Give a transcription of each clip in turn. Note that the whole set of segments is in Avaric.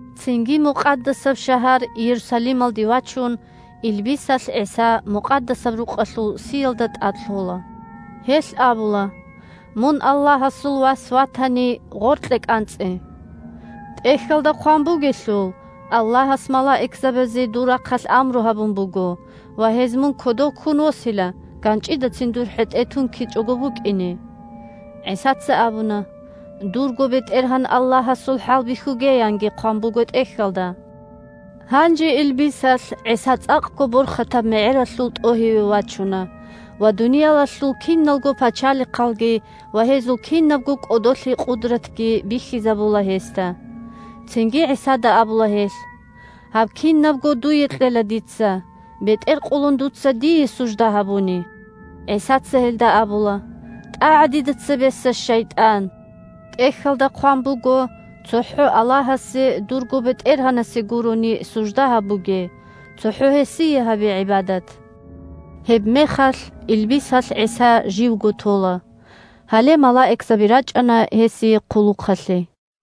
Цинги Мукъадасаб шагьар Иерусалималде вачун, илбисалъ ГӀиса Мукъадасаб Рукъалъул сиялда тӀад лъола. Гьелъ абула: – Мун Аллагьасул Вас ватани, гъоркье кӀанцӀе! ТӀехьалда хъван бугелъул: «Аллагьас малаикзабазе дур рахъалъ амру гьабун буго» ва: «Гьез мун кодов ккун восила, ганчӀидацин дур хӀетӀе тункичӀого букӀине». ГӀисаца абуна: – «Дурго БетӀергьан Аллагьасул хӀалбихьуге!» – янги хъван буго ТӀехьалда. Гьанже илбисалъ ГӀиса цӀакъго борхатаб мегӀералъул тӀогьиве вачуна ва дуниялалъул киналго пачалихъалги ва гьезул кинабго кӀодолъи-къудратги бихьизабула гьесда. Цинги ГӀисада абула гьелъ: – Гьаб кинабго дуе кьела дица, бетӀер къулун дуца дие сужда гьабуни. ГӀисаца гьелда абула: – ТӀагӀа дида цебеса, шайтӀан! ТӀехьалда хъван буго: «ЦохӀо Аллагьасе – дурго БетӀергьанасе – гурони сужда гьабуге. ЦохӀо Гьесие гьабе гӀибадат!» Гьебмехалъ илбисалъ ГӀиса живго тола. Гьале малаикзаби рачӀана гьесие хъулухъалъе.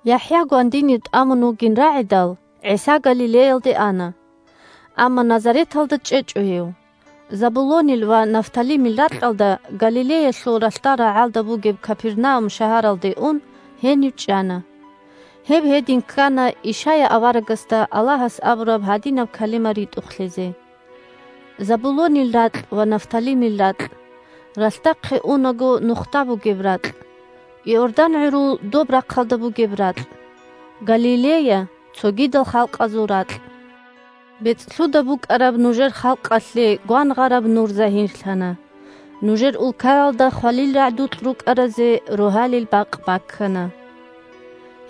ЯхӀя гвандинив тӀамун вугилан рагӀидал, ГӀиса Галилеялде ана. Амма Назареталда чӀечӀо гьев. Забулонил ва Нафталимил ракьалда, Галилеялъул ралъдал рагӀалда бугеб Капернаум шагьаралде ун, гьенив чӀана. Гьеб гьедин ккана Ишая аварагасда Аллагьас абураб гьадинаб калима ритӀухълъизе: «Забулонил ракь ва Нафталимил ракь! Ралъдахъе унаго нухда бугеб ракь! Иордан гӀурул доб рахъалда бугеб ракь! Галилея – цогидал халкъазул ракь! БецӀлъуда букӀараб нужер халкъалъе гвангъараб нур загьирлъана, нужер улкаялда хвалил рагӀдукь рукӀаразе рогьалил бакъ баккана».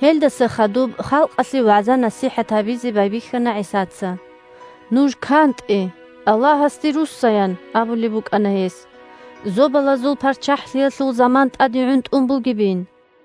Гьелдаса хадуб халкъалъе вагӀза-насихӀат гьабизе байбихьана ГӀисаца. – Нуж кантӀе, Аллагьасде русса! – ян абулеб букӀана гьес. – Зобалазул ПарччахӀлъиялъул заман тӀаде гӀунтӀун бугебин!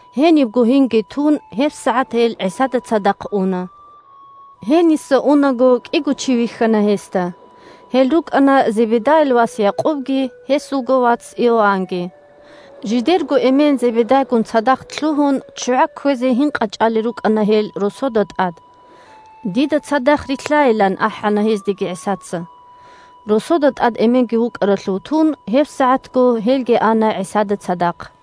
Гьенибго гьинги тун, гьебсагӀат гьел ГӀисада цадахъ уна. Гьениса унаго кӀиго чи вихьана гьесда. Гьел рукӀана Зебедайил вас Якъубги гьесулго вац Иоаннги. Жидерго эмен Зебедайгун цадахъ лъугьун ччугӀа кквезе гьин къачӀалел рукӀана гьел росода тӀад. Дида цадахъ рилълъайилан ахӀана гьездеги ГӀисаца. Росода тӀад эменги вукӀаралъув тун, гьебсагӀатго гьелги ана ГӀисада цадахъ.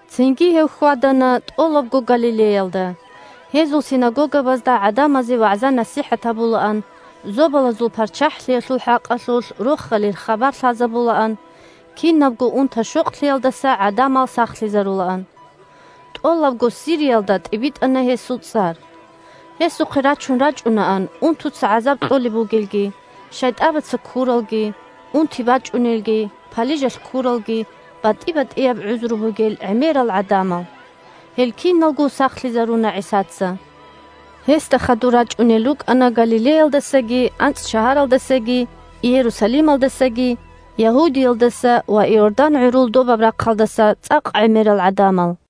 Цинги гьев хьвадана тӀолабго Галилеялда: гьезул синагогабазда гӀадамазе вагӀза-насихӀат гьабулаан, Зобалазул ПарччахӀлъиялъул хӀакъалъулъ Рохалил хабар лъазабулаан, кинабго унта-щокълъиялдаса гӀадамал сахлъизарулаан. ТӀолабго Сириялда тӀибитӀана гьесул цӀар. Гьесухъе рачун рачӀунаан унтуца гӀазаб кьолеб бугелги, шайтӀабаца ккуралги, унти бачӀунелги, палижалъ ккуралги, – батӀи-батӀияб гӀузру бугел гӀемерал гӀадамал. Гьел киналго сахлъизаруна ГӀисаца. Гьесда хадур рачӀунел рукӀана Галилеялдасаги, АнцӀшагьаралдасаги, Иерусалималдасаги, Ягьудиялдаса ва Иордан гӀурул добаб рахъалдаса цӀакъ гӀемерал гӀадамал.